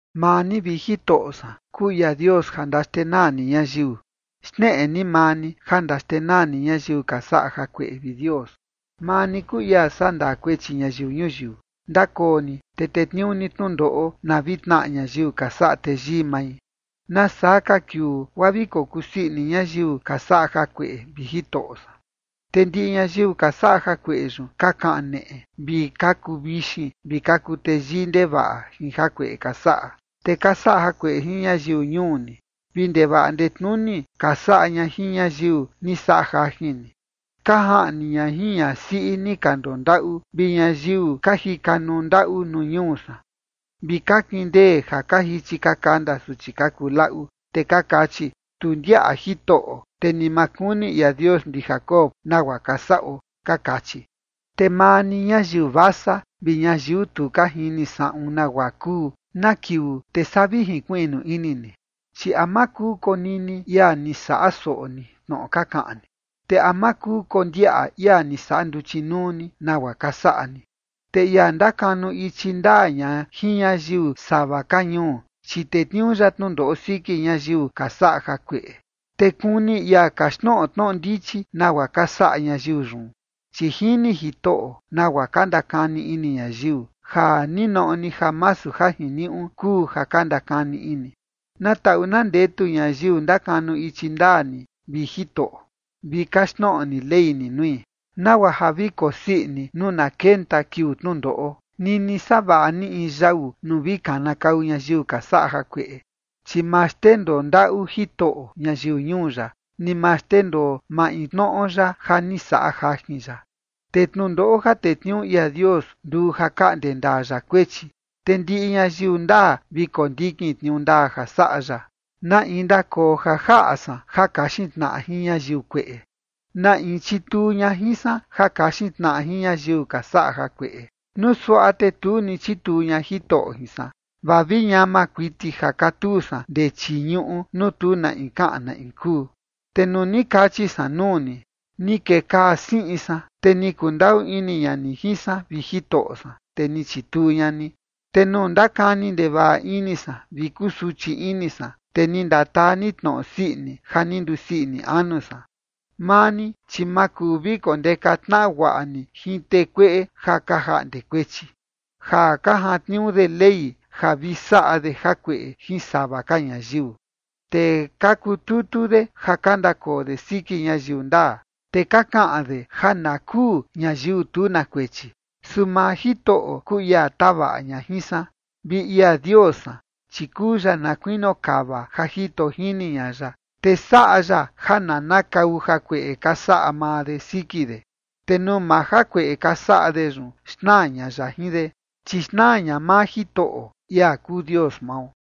Maa ni, vi Jitoꞌo san, kuu ia Dios ja ndaxtenaa ni ñayiu, xneꞌe ni maa ni ja ndaxtenaa ni ñayiu ka saꞌa jakueꞌe, vi Dios. Maa ni kuu ia sandaa kuechi ñayiu ñuyiu, ndakoo ni te tetniuu ni tnundoꞌo, na vi tnaꞌa ñayiu ka saꞌa teyii mai. ¿Nasaa ka kiuu guaa vi kokusii ini ñayiu ka saꞌa jakueꞌe, vi Jitoꞌo san? Te ndiꞌi ñayiu ka saꞌa jakueꞌe yun, ka kaneꞌe vi ka kuvixin vi ka kuteyii ndevaꞌa jin jakueꞌe ka saꞌa. Te ka saꞌa jakueꞌe jin ñayiu ñuu ni, vi ndevaꞌa ndetnuni ka saꞌa ña jin ñayiu ni saꞌa jajin ni. Ka jaꞌni ña jin ñasiꞌi ni ka ndondaꞌu vi ñayiu ka jika nuu ndaꞌu nuu ñuu san, vi ka kindee ja ka jichi ka kanda suchi ka kuu laꞌu. Te ka kachi: “Tu ndiaꞌa Jitoꞌo, te ni ma kuni ia Dios ndi Jacob nagua ka saꞌo”, ka kachi. Te maa ni, ñayiu vasa, vi ñayiu tu ka jini saꞌun nagua kuu, ¿na kiuu te saa vi jinkuiꞌnu ini ni? Chi ¿a ma kuu konini ia ni saꞌa soꞌo ni, tnoꞌo ka kaꞌan ni? Te ¿a ma kuu kondiaꞌa ia ni saꞌa nduchi nuu ni, nagua ka saꞌa ni? Te ia ndakanu ichi ndaa ña jin ñayiu sava ka ñuu, chi tetniuu ya tnundoꞌo siki ñayiu ka saꞌa jakueꞌe, te kuni ia kaxtnoꞌo tnoꞌo ndichi nagua ka saꞌa ñayiu yun. Chi jini Jitoꞌo nagua ka ndakani ini ñayiu, ja ninoꞌo ni masu ja jiniuꞌu kuu ja ka ndakani ini. Na taꞌu na ndetu ñayiu ndakanu ichi ndaa ni, vi Jitoꞌo, vi kaxtnoꞌo ni ley ni nui, nagua ja vi kosii ini nuu na kenta kiuu tnundoꞌo, nini savaꞌa ni in yau nuu vi kanakau ñayiu ka saꞌa jakueꞌe. Chi ma xndendoo ndaꞌu Jitoꞌo ñayiu ñuu ya, ni ma xndendoo maintnoꞌo ya ja ni saꞌa jajin ya. Te tnundoꞌo ja tetniuu ia Dios nduu ja kaꞌnde ndaa ya kuechi, te ndiꞌi ñayiu ndaa vi kondikin tniuu ndaa ja saꞌa ya. ¿Na in ndakoo ja jaꞌa san ja kaxin tnaꞌa jin ñayiu kueꞌe? ¿Na in chituu ña jin san ja kaxin tnaꞌa jin ñayiu ka saꞌa jakueꞌe? Nuu suaꞌa te tu ni chituu ña Jitoꞌo jin san, vaa vi ñama kuiti ja katuu san ndee chii ñuꞌu nuu tu na in kaꞌan na in kuu. Te nuu ni kachi san nuu ni: “Ni kekaa siꞌin san”, te ni kundaꞌu ini ña ni jin san, vi Jitoꞌo san, te ni chituu ña ni. Te nuu ndakani ndevaꞌa ini san vi kusuchi ini san, te ni ndataa ni tnoꞌo sii ini ja ni ndusii ini anu san. Maa ni, chi ma kuu vi kondeka tnaꞌa guaꞌa ni jin tee kueꞌe ja ka jaꞌnde kuechi, ja ka jantniuu de Ley ja vi saꞌa de jakueꞌe jin sava ka ñayiu. Te ka kututu de ja ka ndakoo de siki ñayiu ndaa, te ka kaꞌan de ja na kuu ñayiu tu na kuechi. Su maa Jitoꞌo kuu ia tavaꞌa ña jin san, vi ia Dios san, chi kuu ya na kuinio kava ja jito jini ña ya. Te saꞌa ya ja nanakau jakueꞌe ka saꞌa maa de siki de, te nuu maa jakueꞌe ka saꞌa de yun, xnaa ña ya jin de. Chi xnaa ña maa Jitoꞌo, ia kuu Dios mao.